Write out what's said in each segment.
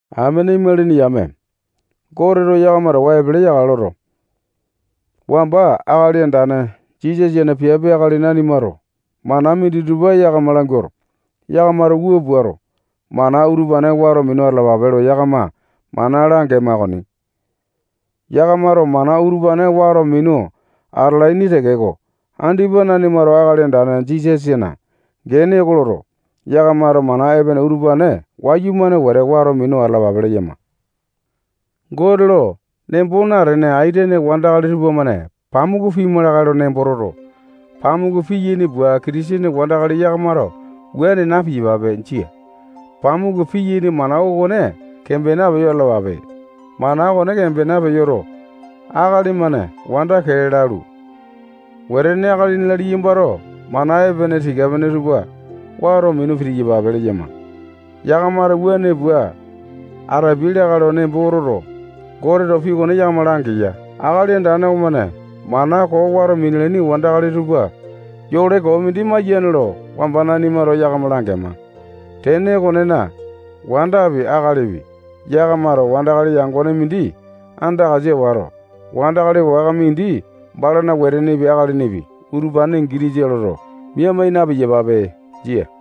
Amene imalini yame, Goteto yakama towa epele yakale loto, wamba Akali Andane Jisasana piape akali nanimato mana minditupa yakama languato, yakamato wua puato, mana utupane wato minu atalapape lo yakama mana langema okoni. Yakamato mana utupane wato minu atalaini tekeko, andipa nanimato Akali Andane Jisasana gene oko loto, yakamato mana epene utupane wayumane wete wato minu atalapape leyama. Gote lo nembo natene aitene wandakali tupamane pamuku pima lakae lo nembo toto, pamuku piyaini pua, Kitisene wandakali yakamato wuane na-piyapape. Jia. Pamuku piyaini mana okone kembena peyo atalapape. Mana okone kembena peyoto, akali-mane wanda kee lalu, wetene, akalini-la, liyambato mana epene tika pene tupa wato minu pitiyapape leyama. Yakamato wuane pua atapiai lakae lo nembo toto, Goteto pii okone yakama langeya. Akali Andane okomane mana koo wato minalaini wandakali tupa yole koo mindi maiyane lo wamba nanimato yakama langema. Tene okonena, wandapi, akalipi, yakamato wandakali yangone mindi andakasa wato, wandakali waka mindi balana wetenepi, akalinipi, utupane gitisa loto, mia mai na-piyapape. Jia.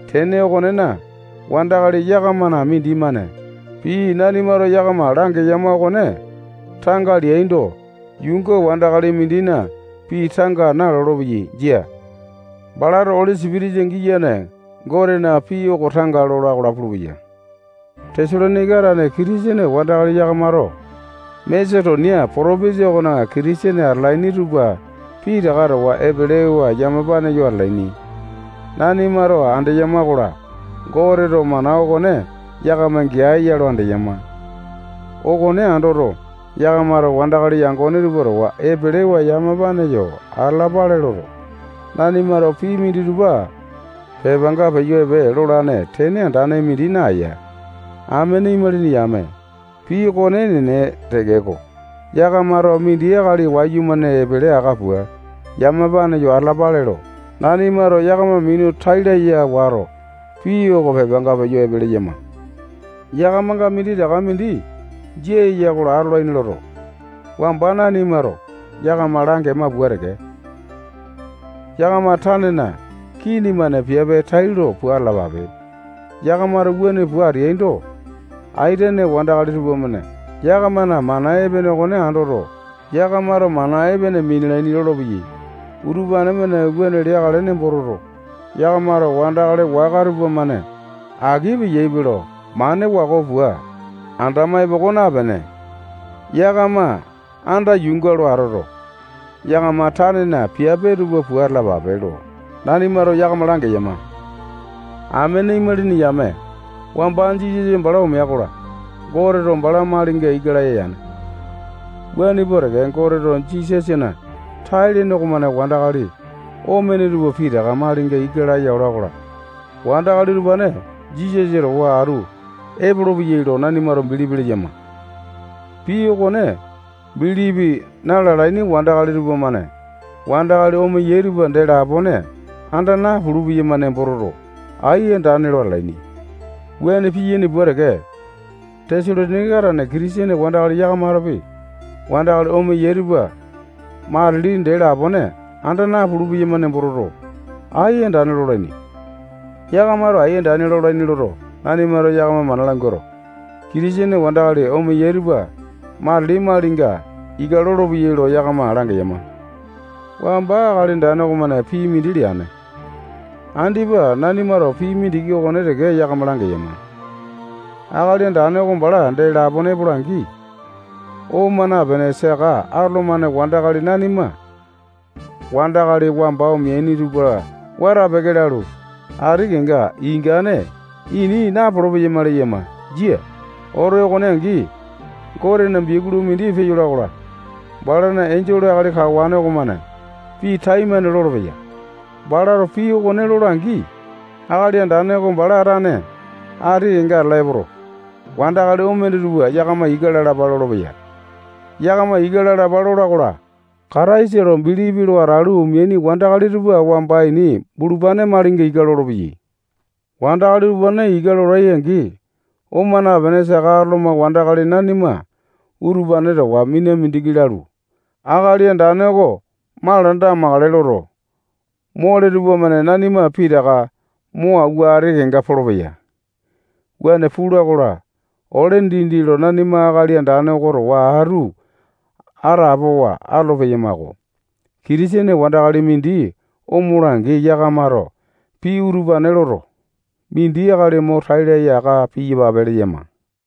Tene okonena, wandakali yakamana mindimane pii nanimato yakama langeyama okone tanga leando, yuunga wandakali mindina pii tanga nalolo-peya. Jia. Balato Oli Sipitisa giyane Gotena pii oko tanga lola-kola pulupeya. Tesalonaika tane Kitisene wandakali yakamato Masetonia potopinjia okona Kitisene atalaini tupa pitaka towa epelewa yamapane yo atalaini. Nanimato andeyama-kola, Goteto mana okone yakama gea ya lo andeyama. Okone andoto, yakamato wandakali yangone tupa towa epelewa yamapane yo atalapale loto, nanimato pii minditupa pepanga peyo epe lolane tene andane mindi naeya. Amene imalini yame, pii okone enene tekeko, yakamato mindi akali wayumane epele aka pua, yamapane yo atalapale lo, nanimato yakama minu tai laya wato, pii oko pepanga peyo epe leyama. Yakamanga minditaka mindi jia eya-kola, atolaini loto, wamba nanimato yakama langema pua teke, yakama tanena kini-mane piape tailo pua atalapape. Yakamato wuane pua ateaindo, aitene wandakali tupamane yakamana mana epene okone andoto, yakamato mana epene minalaini lolopeyai. Utupane-mane wuane leakale nembo toto, yakamato wandakali waka tupamane aki peyaipe lo mane wako pua andama epoko napene, yakama anda yuunga lo atoto, yakama tanena piape tupa pua atalapape lo nanimato yakama langeyama. Amene imalini yame, wamba Jisasa bala omea-kola, Goteto bala malinga ika laya yane. Wuane pua teke, Goteto Jisasana tai-lene okomane wandakali omene tupa pitaka malinga ika laya ola-kola, wandakali utupane Jisasa towa atu epolopeyai lo nanimato bilipi leyama. Pii okone bilipi na-lalaini wandakali tupamane wandakali omeyai tupa dee lapone anda napulu-peyama nembo toto, ai andane lo atalaini. Wuane piyaini pua teke, Tesalonaika tane Kitisene wandakali yakamatopi wandakali omeyai tupa matili dee lapone anda napulu-peyama nembo toto, ai andane lolaini. Yakamato ai andane lolaini loto, nanimato yakama mana languato, Kitisene wandakali omeyai tupa matili malinga ika lolopeyai lo yakama langeyama. Wamba Akali Andane okomane pii mindi leane. Andipa nanimato pii mindiki okone teke yakama langeyama. Akali Andane oko bala dee lapone epola-angi, oma napene saka atolomane wandakali nanima wandakali wamba omeaini tupa wata-peke lalu, ati kenga ingane ini napolo-peyama leyama. Jia. Oto okone angi, Gotena biakulu mindi peyola-kola, balana enjole akali kawane okomane pii taimane lolopeya. Balato pii okone lola-angi, Akali Andane oko bala tane ati kenga atala epoto, wandakali omene tupa yakama ika lalapa lolopeya. Yakama ika lalapa lola-kola, Kataisa lo bilipi lo atalu omeaini wandakali tupa wamba ini bulupane malinga ika lolopeya. Wandakali utupane ika lolai-angi, oma napene saka atoloma wandakali nanima utupane towa mina mindiki lalu, Akali Andane oko malanda amakale loto, mole tupamane nanima pitaka mo awua ati kenga polopeya. Wuane pula-kola, ole dindi lo nanima Akali Andane oko towa atu atapowa atolo-peyamako. Kitisene wandakali mindi omola-angi, yakamato pii utupane loto, mindi akali mo tai laya aka piyapape leyama.